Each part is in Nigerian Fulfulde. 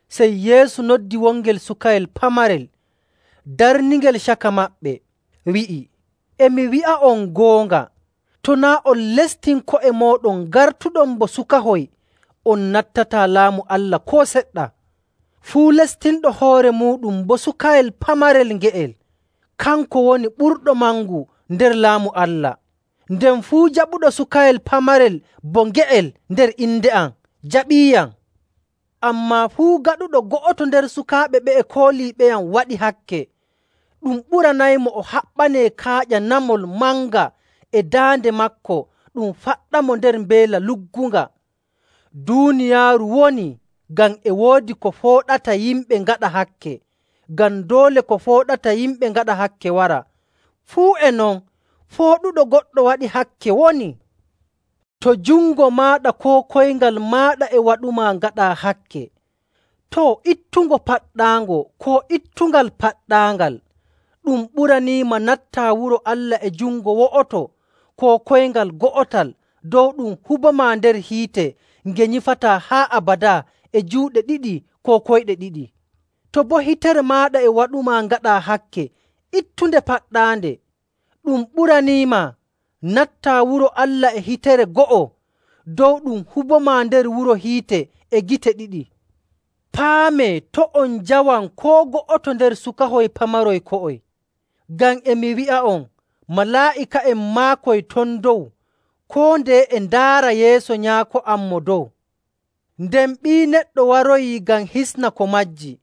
Sey Yeesu noddi wongel sukayel pamarel darningel caka maɓɓe, wi'i, “E mi wi'a'on goonga, to naa' on lestin ko'e mooɗon ngartuɗon bo sukahoy, on nattataa Laamu Allah koo seɗɗa!. Fuu lestinɗo hoore muuɗum bo sukayel pamarel nge'el, kanko woni ɓurɗo mangu nder Laamu Allah. Nden fuu jaɓuɗo sukayel pamarel bo nge'el nder inde am jaɓiiyam. “Ammaa fuu gaɗuɗo go'oto nder sukaaɓe ɓe'e kooliiɓeyam waɗi hakke, ɗum ɓuranaymo o haɓɓanee kaaƴa namol manga e daande maako ɗum faɗɗamo nder mbeela luggunga. Duuniyaaru wonii ngam e woodi ko fooɗata yimɓe ngaɗa hakke! Ngam doole ko fooɗata yimɓe ngaɗa hakke wara, fuu e non fooɗuɗo goɗɗo waɗi hakke wonii. “To jungo maaɗa koo koyngal maaɗa e waɗumaa ngaɗaa hakke, too, ittungo paɗɗaango, koo ittungal paɗɗaangal. Ɗum ɓuraniima nattaa wuro Allah e jungo wo'oto koo koyngal go'otal dow ɗum hubomaa nder hiite nge nyifataa haa abadaa e juuɗe ɗiɗi koo koyɗe ɗiɗi.. To boo hitere maaɗa e waɗumaa ngaɗaa hakke, ittunde paɗɗaande. Ɗum ɓuraniima nattaa wuro Allah e hitere go'o dow ɗum hubomaa nder wuro hiite e gite ɗiɗi.. “Paamee, to' on njawan koo go'oto nder sukahoy pamaroy ko'oy. Ngam e mi wi'a'on, malaa'ika'en maakoy ton dow koo ndeye e ndaara yeeso Nyaako am Mo Dow.. [Nden Ɓii Neɗɗo waroyii ngam hisna ko majji.].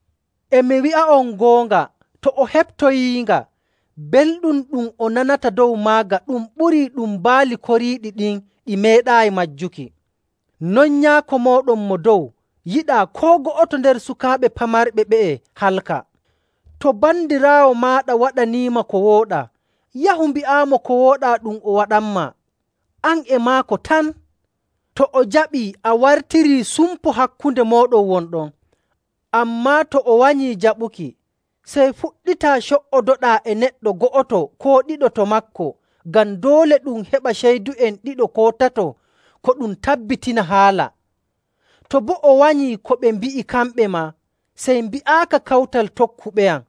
E mi wi'a'on goonga, to o heɓtoyiinga, belɗum ɗum o nanata dow maaga ɗum ɓurii ɗum baali koriiɗi ɗin ɗi meeɗaayi majjuki. Non Nyaako mooɗon Mo Dow yiɗaa koo go'oto nder sukaaɓe pamarɓe ɓe'e halka. “To bandiraawo maaɗa waɗaniima ko wooɗaa, yahu mbi'aamo ko wooɗaa ɗum o waɗanmaa, an e maako tan. To o jaɓii, a wartirii sumpo hakkunde mooɗon won ɗon.. Ammaa to o wanyii jaɓuki, sey fuɗɗitaa co''odoɗaa e neɗɗo go'oto koo ɗiɗo to maako, ngam ‘doole ɗum heɓa ceydu'en ɗiɗo koo tato ko ɗum tabbitina haala.’. To boo o wanyii ko ɓe mbi'i kamɓe maa, sey mbi'aaka kawtal tokkuɓeyam.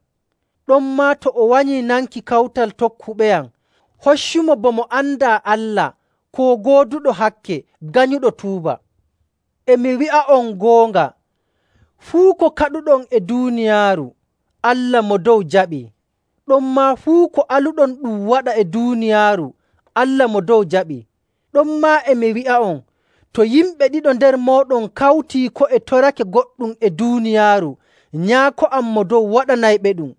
Ɗonmaa to o wanyii nanki kawtal tokkuɓeyam, hoccumo bo mo andaa Allah koo gooduɗo hakke ganyuɗo tuuba. “E mi wi'a'on goonga, fuu ko kaɗuɗon e duuniyaaru, Allah Mo Dow jaɓi. Ɗonmaa fuu ko aluɗon ɗum waɗa e duuniyaaru, Allah Mo Dow jaɓi.. “Ɗonmaa, e mi wi'a'on, to yimɓe ɗiɗo nder mooɗon kawtii ko'e torake goɗɗum e duuniyaaru, Nyaako am Mo Dow waɗanayɓeɗum.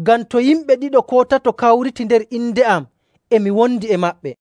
Ngam to yimɓe ɗiɗo koo tato kawriti nder inde am, e mi wondi e maɓɓe.”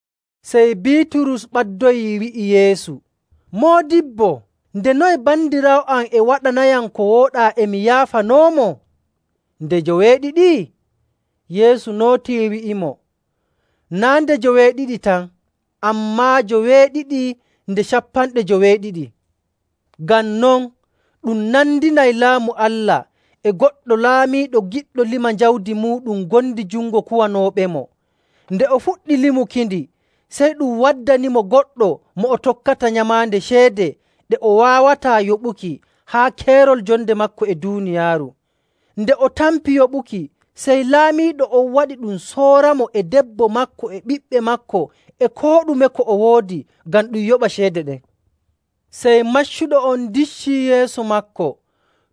Sey Biiturus ɓaddoyii wi'i Yeesu, “Moodibbo, nde noye bandiraawo am e waɗanayam ko wooɗaa e mi yaafanoomo? Nde joweeɗiɗi?” Yeesu nootii wi'imo, “Naa' nde joweeɗiɗi tan, ammaa joweeɗiɗi nde cappanɗe joweeɗiɗi... Ngam non, ɗum nandinay Laamu Allah e goɗɗo laamiiɗo giɗɗo lima jawdi muuɗum ngondi jungo kuwanooɓemo. Nde o fuɗɗi limukindi, sey ɗum waddanimo goɗɗo mo o tokkata nyamaande ceede ɗe o waawataa yoɓuki haa keerol jonde maako e duuniyaaru. Nde o tampi yoɓuki, sey laamiiɗo on waɗi ɗum sooramo e debbo maako e ɓiɓɓe maako e koo ɗume ko o woodi ngam ɗum yoɓa ceede ɗen. Sey maccuɗo on diccii yeeso maako,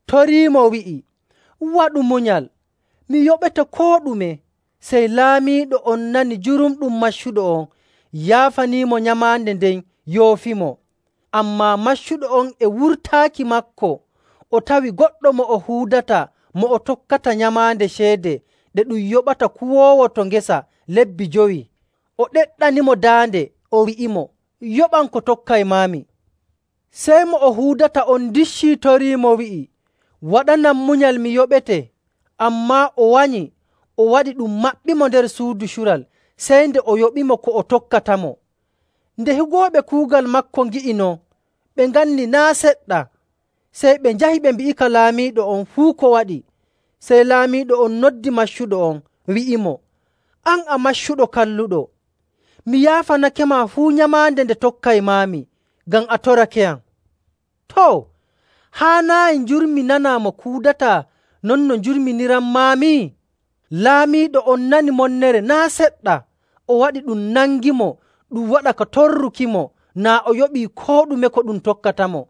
toriimo, wi'i, ‘Waɗu munyal. Mi yoɓete koo ɗume.’ Sey laamiiɗo on nani jurumɗum maccuɗo on yaafaniimo nyamaande nden yoofimo. “Ammaa maccuɗo on e wurtaaki maako o tawi goɗɗo mo o huudata mo o tokkata nyamaande ceede ɗe ɗum yoɓata kuwoowo to ngesa lebbi jowi. O ɗeɗɗanimo daande, o wi'imo, ‘Yoɓam ko tokkaymaami!’ Sey mo o huudata on dicci toriimo, wi'i, ‘Waɗanam munyal mi yoɓete.’ Ammaa o wanyi, o waɗi ɗum maɓɓimo nder suudu cural sey nde o yoɓimo ko o tokkatamo. Nde higooɓe kuugal maako ngi'i non, ɓe nganni naa' seɗɗa. Sey ɓe njahi ɓe mbi'ika laamiiɗo on fuu ko waɗi. “Sey laamiiɗo on noddi maccuɗo on, wi'imo, ‘An a maccuɗo kalluɗo! Mi yaafanakema fuu nyamaande nde tokkaymaami ngam a torakeyam. Too, haanaayi njurminanaa mo kuudataa non no njurminiranmaami?’ Laamiiɗo on nani monnere naa' seɗɗa, o waɗi ɗum nangimo ɗum waɗa ka torrukimo naa o yoɓii koo ɗume ko ɗum tokkatamo.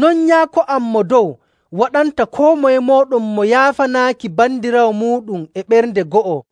“Non Nyaako am Mo Dow waɗanta koo moye mooɗon mo yaafanaaki bandiraawo muuɗum e ɓernde go'o.”